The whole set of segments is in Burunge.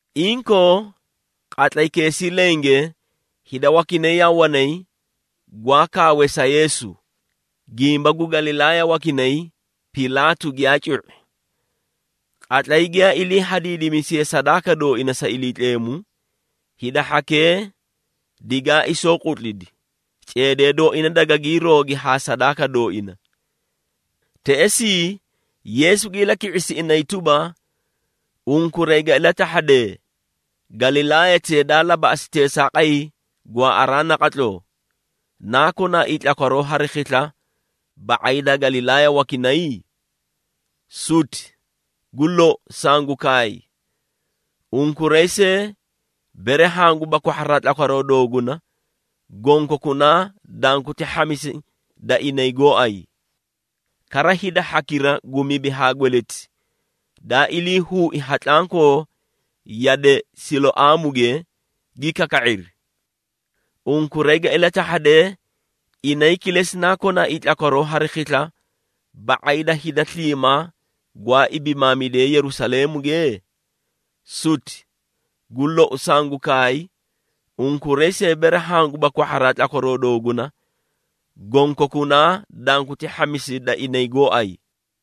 Inkoo, qatlaykeesii lenge, hida wakinay yaa wanay, gwaa kaawee sa Yeesu, gimba gu Galilaaya wakinay Pilaatu giyaa cu⁄i. Qatlay giyaa ilii hadiidimisiyee sadaaka dooina sa Iliitleemu, hida hhakee digaa isooqutlidi, ceedee dooina dagaa hiiroogi haa sadaaka dooina. Teꞌesii, Yeesu gi ilaki⁄isi inay tuba, “Unkuray ga ilatahhadee, Galilaayatee daa labaꞌasi teesaaqay gwaaꞌaraa naqatloo, naa konaaii tlakwaroo hari khisla, ba⁄ay da Galilaaya wakinay? Suti! Gu lou, sangu kaay, unkuray see bere hanguba kwahharaa tlakwaroo dooguna, gonkokunaa danguti hhamisi da inay gooay. Kara hida hhakira gu mibi haa gweleti, daa ilii huui ha tlankoo yade Siloaamuge, gi kaka⁄iri. Unkuray ga ilatahhadee inay kilesi naa konaaii tlakwaroo hari khisla, ba⁄ay da hida sliimaa gwaa ibimaamidee Yerusaleemuge? Suti! Gu lou, sangu kaay, unkuray see bere hanguba kwahharaa tlakwaroo dooguna, gonkokunaa danguti hhamisi da inay gooay.”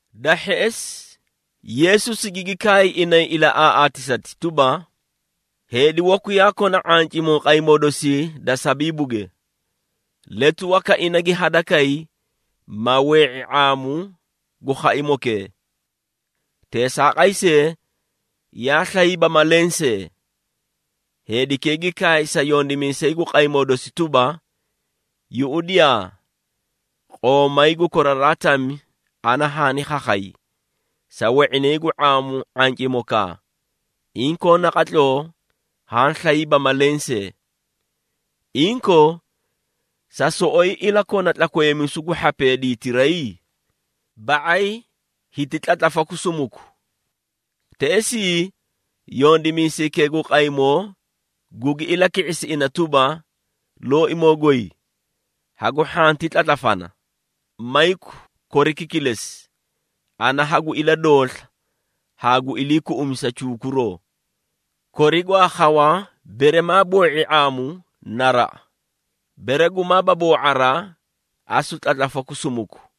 Da hheꞌesi Yeesu sigigi kaay inay ilaꞌaaꞌaatisati tuba, “Heedi waku yaa kona ⁄ancimoo qaymoo dosii da sabiibuge. Letu waka ina gi hadakay, ma wee⁄i ⁄aamu gu khaimokee. Teesaaqay see, yaa slayiiba ma lensee. Heedikee gi kaay sa yondimiisay gu qaymoo dosi tuba, ‘Yuꞌudiyaa! Qoomay gu koraraa tami ana haani khakhay, sa we⁄inay gu ⁄aamu ⁄ancimokaa, inkoo naqatloo haã slayiiba ma lensee. Inkoo, sa soꞌoyi ilakona tlakweemisu gu hhapee diitiray? Ba⁄ay hiti tlatlafaku sumuku.’ Teꞌesii, yondimiisaykee gu qaymoo gugi ilaki⁄isi ina tuba, ‘Looimoo goy, hagu hhanti tlatlafana, mayku koriki kilesi, ana hagu iladoosla haa gu iliikuꞌumisa chuukuroo. Kori gwaa khawa bere maa boo⁄i ⁄aamu, naraꞌa! Bere gumaaba boo⁄araa, asu tlatlafaku sumuku.’”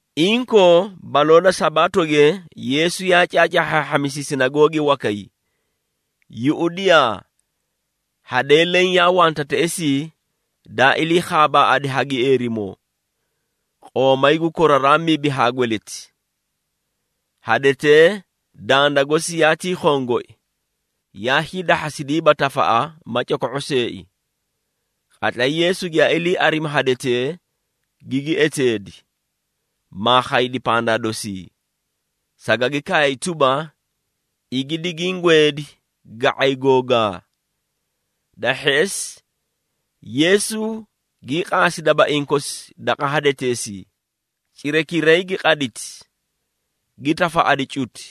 Inkoo, baloo da Sabaatoge Yeesu yaa caacaahhaahhamisi sinagoogi wakay. Yuꞌudiyaa, hadee leẽ yaa wanta teꞌesii daa ilii khaabaaꞌadi ha gieerimoo, qoomay gu koraraa mibi haa gweleti. Hadetee danda gosi yaatii khongoi, yaa hiidahhasidiiba tafaꞌa ma coko⁄o seei. Qatlay Yeesu giyaa ilii arimi hadetee, gigi eteedi, maa khaydi pandaa dosii, sagagi kaay tuba, “Igi digiĩ gweedi ga⁄ay googaa.” Da hheꞌesi, Yeesu gii qaasi dabaiĩ kosi daqa hadeteesii, cirakiray gi qaditi, gi tafaꞌadi cuti.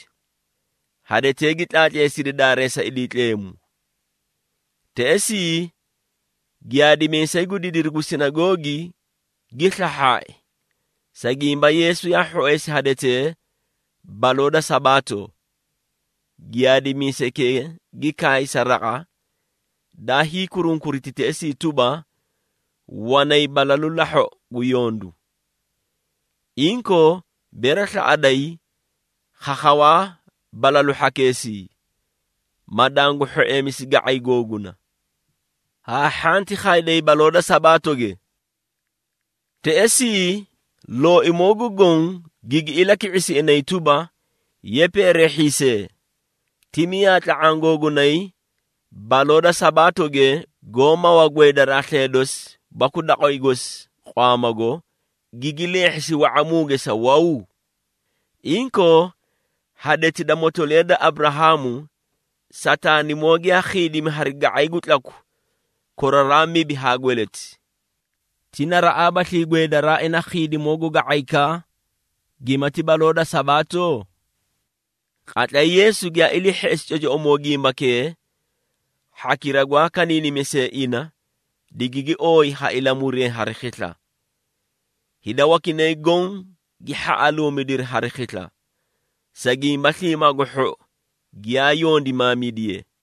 Hadetee gi tlaatleesidi daareesa Iliitleemu. Teꞌesii, giyaadimiisay gu didiru gu sinagoogi, gi slahhaai, sa gimba Yeesu yaa hhoeesi hadetee baloo da Sabaato. Giyaadimiisaykee gi kaay sa raqa, daa hiikurunkuriti teꞌesii tuba, “Wanay balalu lahhoꞌo gu yondu. Inkoo bere slaꞌaday, khakhawaa balalu hhakeesii, ma dangu hhoeemisi ga⁄ay googuna. Haa hhanti khayday baloo da Sabaatoge.” Teꞌesii, Looimoo gu Goõ, gigi ilaki⁄isi inay tuba, “Ye peereehhiisee! Ti miyaa tla⁄aã googunay baloo da Sabaatoge, goó mawa gweedaraa slee dosi baku daqway gosi qwaamaago, gigi leehhisi wa⁄amuuge sa waw? Inkoo, hadeti da motoliya da Aburahaamu, Sataanimoo giyaa khiidimi hari ga⁄ay gu tlaku koraraa mibi haa gweleti. Ti naraꞌaabaslii gweedaraa ina khiidimoo gu ga⁄aykaa, gimati baloo da Sabaato?” Qatlay Yeesu giyaa ilii hheꞌesi cocoꞌomoo gimbakee, hhakira gwaa kaniinimisee ina, digigi ooyi ha ilamuree hari khisla. Hida wakinay goõ gi hhaꞌaluumidiri hari khisla, sa gimba sliimaa gu hhou giyaa yondimaamidiye.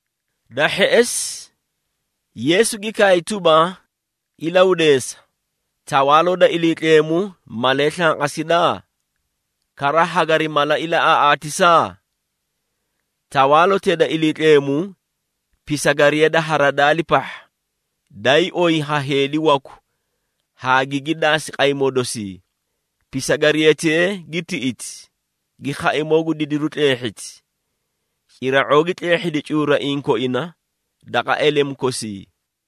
Da hheꞌesi, Yeesu gi kaay tuba, “Ilahudeesa, Tawaaloo da Iliitleemu malee slanqasida? Kara hagari mala ilaꞌaaꞌaatisa? Tawaalotee da Iliitleemu pisagariya da haradaali pahha, daayii oyi ha heedi waku haa gigi daasi qaymoo dosii. Pisagariyatee gi tiꞌiti, gi khaimoo gu didiru tleehhiti. Cira⁄oo gi tleehhedi cuuraiĩ koina daqa elemu kosii.”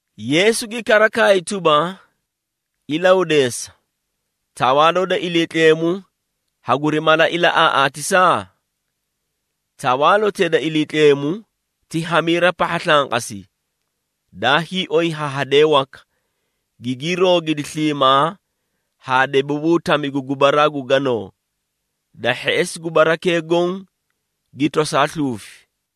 Yeesu gi kara kaay tuba, “Ilahuudeesa, Tawaaloo da Iliitleemu haguri mala ilaꞌaaꞌaatisa? Tawaalotee da Iliitleemu ti hamiira pahha slanqasi, daa hiioy ha hadee waka, gigii roogidi sliimaa haa debabuu tami gu gubaraa gu ganoo, da hheꞌesi gubarakee goõ gi tosaa sluufi.”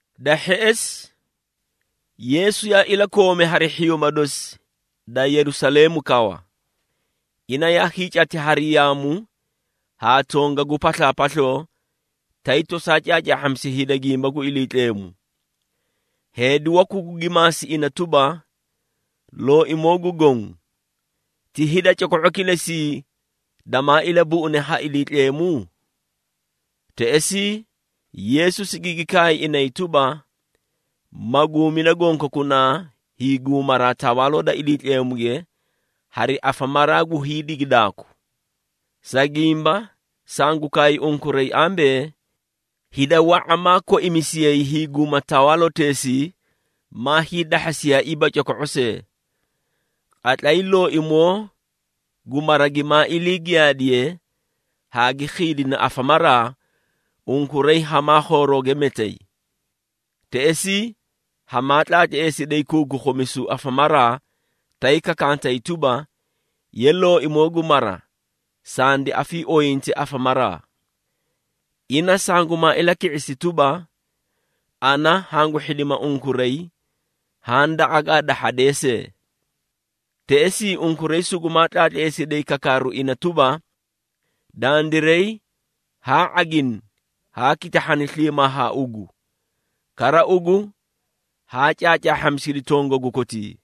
Da hheꞌesi, Yeesu yaa ilakoomi hari hhiyuuma dosi da Yerusaleemu kawa. Ina yaa hiicacati hari yaamu haa tongagu paslaapasloo, tay tosaa caacaahhamisi hida gimba gu Iliitleemu. Heedi waku gugi maasi ina tuba, “Looimoo gu Goõ, ti hida coko⁄o kilesii damaailabuꞌune ha Iliitleemu?” Teꞌesii, Yeesu sigigi kaay inay tuba, “Maguumida gonkokunaa hiiguumaraa, Tawaaloo da Iliitleemuge hari afamaraa gu hiidigidaaku. Sa gimba, sangu kaay unkuray ambee, hida wa⁄a maa koimisiyay hiiguma tawaaloteesii, maa hiidahhasiyaaiiba coko⁄o see. Qatlay looimoo gu mara gimaa ilii qadidiye haa gi khiidina afamaraa, unkuray hamaa khoorooge metay. Teꞌesii, hamaa tlaatleesiday kuukukhumisu afamaraa, tay kakantay tuba, ‘Ye looimoo gu mara, sandi afiiooyinte afamaraa.’ Ina sangumaa ilaki⁄isi tuba, ‘Ana hangu hhidima unkuray, haã daqa gaa dahhadee see.’ Teꞌesii unkuray sugumaa tlaatleesiday kakaaru ina tuba, ‘Dandiray haa ⁄agini haa kitahhani sliimaa haa ugu, kara ugu haa caacaahhamisidi tongagu kotii.’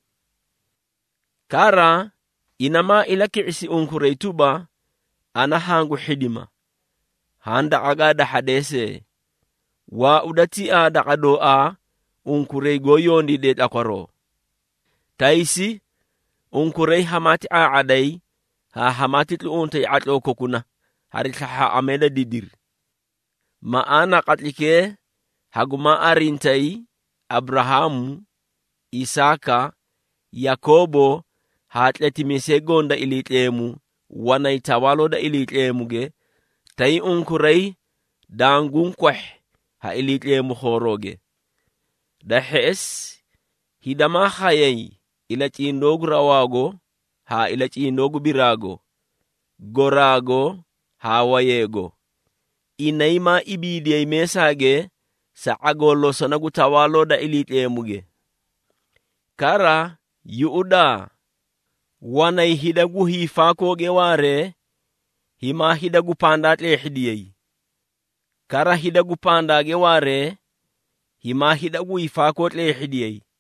Kara, ina maa ilaki⁄isi unkuray tuba, ‘Ana hangu hhidima haã daqa gaa dahhadee see. Waauda tiaa daqa dooaa unkuray goó yondiidee tlakwaroo!’ Taysi unkuray hamaati ⁄aa⁄aday haa hamaati tluꞌuntay ⁄atloo kokuna hari slahhaaꞌamee da didiri. Maꞌaana qatlaykee hagumaa arintayi Aburahaamu, Isaaka, Yakoobo haa tletimiisee goõ da Iliitleemu, wanay Tawaaloo da Iliitleemuge, tay unkuray danguũ kwahhi ha Iliitleemu khoorooge! Da hheꞌesi, hida maa khayay ilacindoo gu rawaago haa ilacindoo gu biraago, goraago haa wayeego. Inay maa ibiidiyay meesaage sa ⁄agoo losona gu Tawaaloo da Iliitleemuge. Kara yuꞌudaa! Wanay hida gu hiifaakooge waaree himaa hida gu pandaa tleehhidiyay, kara hida gu pandaage waaree himaa hida gu hiifaakoo tleehhidiyay.”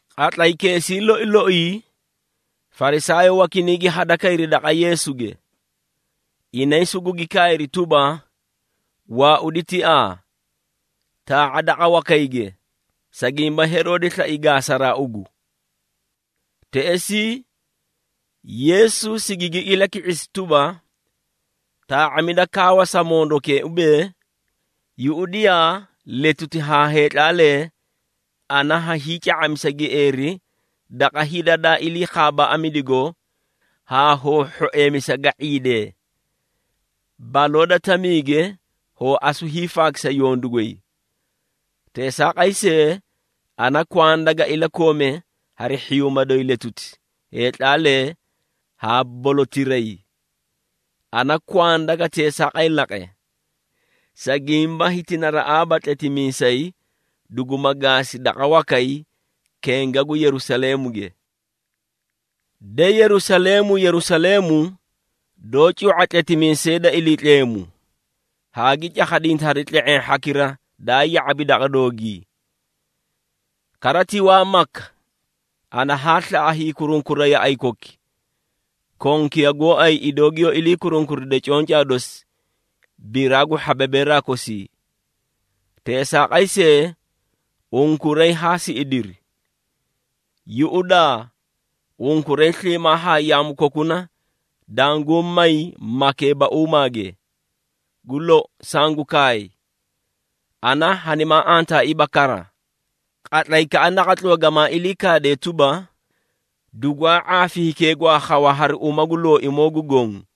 Qatlaykeesii loi loii, Farisaayoo wakinay gi hadakayri daqa Yeesuge. Inay sugugi kaayri tuba, “Waaudi tiaa, taa⁄a daqa wakayge, sa gimba Heroode slai gaasaraa ugu.” Teꞌesii, Yeesu sigigi ilaki⁄isi tuba, “Taa⁄amida kaawa sa mondokee ubee, ‘Yuꞌudiyaa, letuti haa heetlaalee ana ha hiica⁄amisa gieeri daqa hida daa iliikhaabaꞌamidigo haa hoo hhoeemisa ga⁄iidee. Baloo da tamiige hoo asu hiifaakisa yondu goy.’ Teesaaqay see, ana kwanda ga ilakoome hari hhiyuuma doyi letuti, heetlaalee haa bolatiray. Ana kwanda ga teesaaqay laqe, sa gimba hiti naraꞌaaba tletimiisay duguma gaasi daqa wakay kenga gu Yerusaleemuge. De, Yerusaleemu, Yerusaleemu, doó cu⁄a tletimiisee da Iliitleemu, haa gi cakhadinta hari tle⁄eẽ hhakira daa ya⁄abi daqa doogii! Kara ti waa maka ana haa slaꞌa hiikurunkura yaꞌay koki, konkiya gooay idoo giyoó ilii kurunkuride concaa dosi biraa gu hhababeeraa kosii. Teesaaqay see, unkuray haa siꞌidiri! Yuꞌudaa! Unkuray sliimaa haa yaamu kokuna danguũ may makeebauumaage. Gu lou, sangu kaay, ana hanimaa antaaiiba kara, qatlaykaꞌa naqatloo gamaa ilii kaadee tuba, ‘Dugwaa ⁄aafi hikee gwaa khawa hari uma gu Looimoo gu Goõ.’”